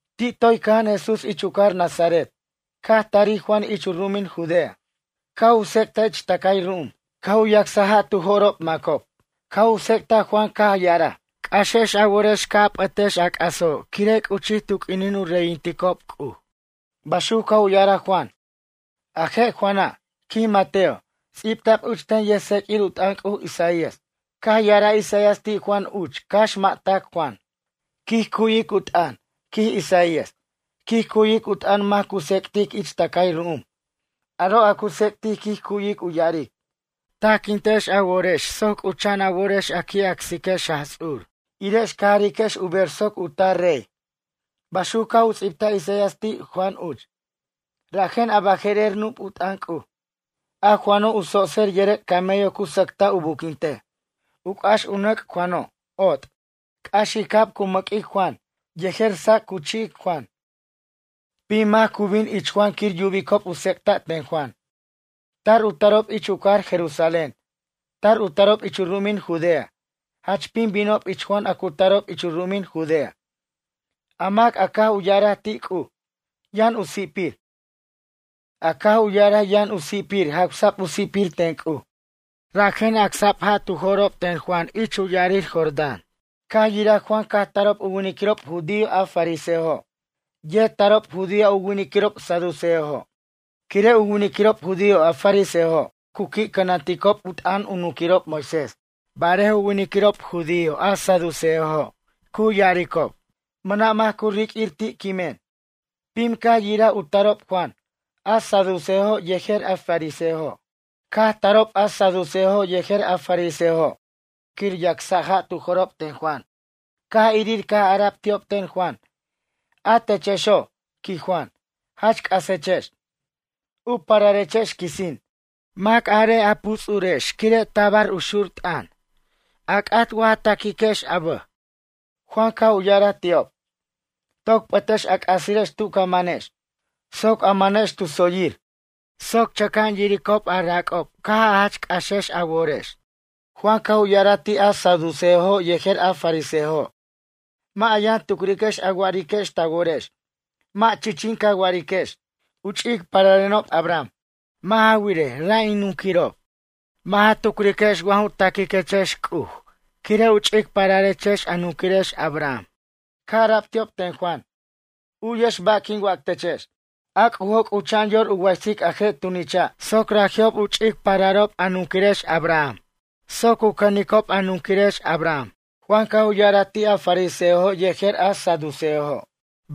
Ti' toy cʌja'an Jesús ich u cajar Nazaret, caj tarij Juan ich u ru'umin Judea. Caj u tsec'taj ich tʌcay ru'um. Caj u yacsaj ja' tu jo'rob macob. Caj u tsec'taj Juan caj ya'araj: ―C'axex a worex ca' a p'ʌtex a c'aso' quire' c'uchij tu q'uinin u reyinticob C'uj ―baxuc caj u ya'araj Juan. A je' Juana', quij Mateo, ts'ibta'b uch ten yʌjtseq'uir u t'ʌn C'uj Isaías. Caj ya'araj Isaías ti' Juan uch cax mʌ' tac Juan: Quij cu'wic u t'ʌn, quij Isaías. Quij cu'wic u t'ʌn mac cu tsec'tic ich tʌcay ru'um. Aro' a cu tsec'tic quij cu'wic u ya'aric: “Tajquintex a worex soc c'ucha'an a worex a qui' acsiquex Jaj Ts'ur, irex ca jariquex u ber soc u tar rey.” Baxuc caj u ts'ibtaj Isaías ti' Juan uch. Rajen a baje'rer nup' u t'ʌn C'uj. A Juano' u tsotser yʌrʌc' camello cu sacta' u buquintej. U c'ax u nʌc' Juano', ot'. C'axicab cu mʌq'uic Juan, yejer sac' cu chi'ic Juan. Pim mac cu bin ich Juan quir yubicob u tsec'ta' ten Juan. Tar u tarob ich u cajar Jerusalén. Tar u tarob ich u ru'umin Judea. Jach pim binob ich Juan a cu tarob ich u ru'umin Judea. A mac a caj u ya'araj ti' C'uj, yʌn u si'pir. A caj u ya'araj yʌn u si'pir jawsa'b u si'pir ten C'uj. Rajen acsa'b ja' tu jo'rob ten Juan ich ya'arir Jordán. Caj yiraj Juan caj tarob u winiquirob judío a fariseojo'. Yet tarob judío a u winiquirob saduceojo'. Quire' u winiquirob judío a fariseojo' cu qui' cʌnanticob u t'ʌn u nunquirob Moisés. Barej u winiquirob judío a saduceojo' cu ya'aricob: ―Mʌna' mac cu riq'uir ti' quimen. Pim caj yiraj u tarob Juan, a saduceojo' yejer a fariseojo'. Caj tarob a saduceojo' yejer a fariseojo' quir yacsa' ja' tu jo'rob ten Juan. Caj irir caj ara'b ti'ob ten Juan: ―A techexo' ―quij Juan―, jach c'asechex. U pararechex quisin. A mac arej a puts'urex quire' tabar u tar xur t'ʌn. A c'at wa ja taquiquex a bʌj? Juan caj u ya'araj ti'ob: ―Toc p'ʌtex a c'asirex tu ca mʌnex, soc a mʌnex tu tsoyir, soc chʌca'an yiricob a rac'ob caj a jach c'axex a worex. Juan caj u ya'araj ti' a saduceojo' yejer a fariseojo': ―Mʌ' a yʌn tucriquex a wa'ariquex ta worex. Mʌ' chichin ca wa'ariquex: “U ch'ic pararenob Abraham. Mʌ' ja wirej, ra' in nunquirob'.” Mʌ' ja tucriquex wa ju taquiquechex C'uj quire' u ch'ic pararechex a nunquirex Abraham. Caj ara'b ti'ob ten Juan: ―U'yex ba' quin wac techex. A C'ujo' c'ucha'an yor u waysic a je' tunicha' soc raji'ob u ch'ic pararob a nunquirex Abraham soc u cʌnicob a nunquirex Abraham. Juan caj u ya'araj ti' a fariseojo' yejer a saduceojo':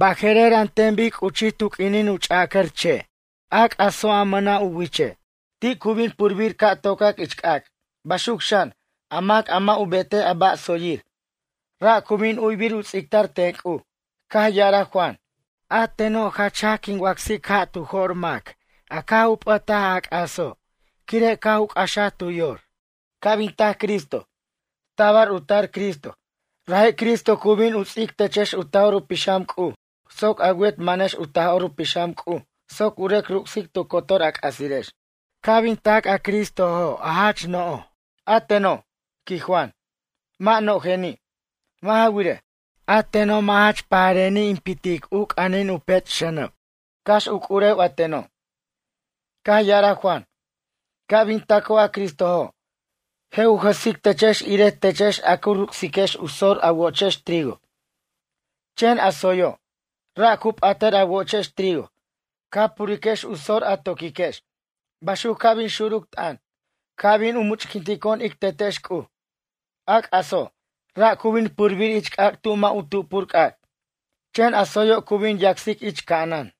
―Baje'rer an ten bic c'uchij tu q'uinin u ch'ʌcar che' a c'aso' a mʌna' u wiche'. Ti' cu bin purbir ca' tocac ich c'ac'. Baxuc xan, a mac a mʌ' u betej a ba' tsoyir, ra' cu bin u'wibir u ts'ictar ten C'uj. Caj ya'araj Juan: ―A teno' jach jaj quin wacsic ja' tu jo'r mac a caj u p'ʌtaj a c'aso' quire' caj u c'axaj tu yor. Ca' bin tac Cristo. Tabar u tar Cristo. Raji' Cristo cu bin u ts'ic techex u Taj'or u Pixam C'uj soc a wet manex u Taj'or u Pixam C'uj soc u rʌc ruc'sic tu cotor a c'asirex. Ca' bin tac a Cristoji' jach no'oj. A teno' ―quij Juan―, mʌ' no'ojeni'. Mʌ' ja wirej, a teno' mʌ' jach pajareni' in pitic u c'anin u pech' xʌnʌb, cax u c'urewen a teno'. Caj ya'araj Juan: ―Ca' bin taco' a Cristojo', je' u jʌsic techex irej techex ca ruc'siquechex u sor a wochex trigo. Chen a tsoyo', ra' cu p'atʌr a wochex trigo. Ca puriquex u sor a to'quiquex. Baxuc ca' bin xuruc t'ʌn, ca' bin u much'quintico'on ic Tetex C'uj. A c'aso', ra' cu bin purbir ich c'ac' tu mʌ' u tupur c'ac'. Chen a tsoyo' cu bin yacsac ich ca'anan.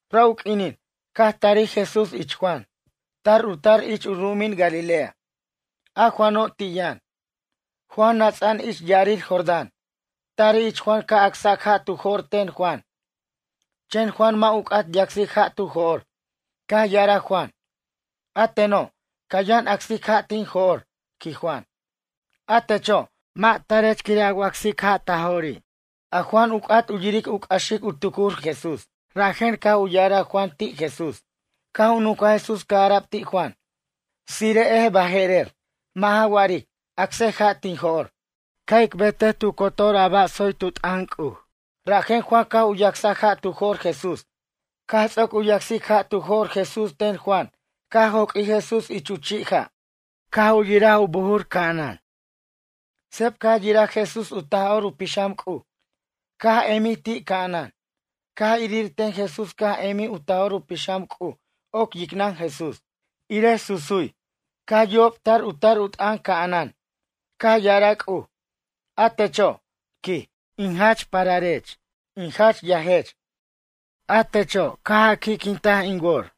Ra' u q'uinino', caj tarij Jesús ich Juan. Tar u tar ich u ru'umin Galilea. A Juano' ti' yʌn. Juan nʌts'a'an ich ya'arir Jordán. Tarij ich Juan ca' acsac ja' tu jo'r ten Juan. Chen Juan mʌ' ju c'at yacsic ja' tu jo'r. Caj ya'araj Juan: ―A teno', ca yʌn acsic ja' tin jo'r ―quij Juan―. A techo', mʌ' tarech quir in wacsic ja' ta jo'ri'. A Juan u c'at u yiric u c'axic u tucur Jesús rajen caj u ya'araj Juan ti' Jesús. Caj u nuncaj Jesús caj ara'b ti' Juan: ―Tsire'ej baje'rer. Mʌ' ja wa'aric. Acsej ja' tin jo'r. Ca' ic betej tu cotor a ba' tsoy tu t'ʌn C'uj. Rajen Juan caj u yacsaj ja' tu jo'r Jesús. Caj ts'oc u yacsic ja' tu jo'r Jesús ten Juan caj joq'uij Jesús ich chi' ja', caj yiraj u buj ca'anan. Seb caj yiraj Jesús u Taj'or u Pixam C'uj. Caj emij ti' ca'anan. Caj irir ten Jesús caj emij u Taj'or u Pixam C'uj oc yicnʌn Jesús. Irej susuy. Caj yubob tar u tar u t'ʌn ca'anan. Caj ya'araj C'uj: ―A techo' ―quij―, a jach in pararech, in jach yajech. A techo' caj a qui'quintaj in wor.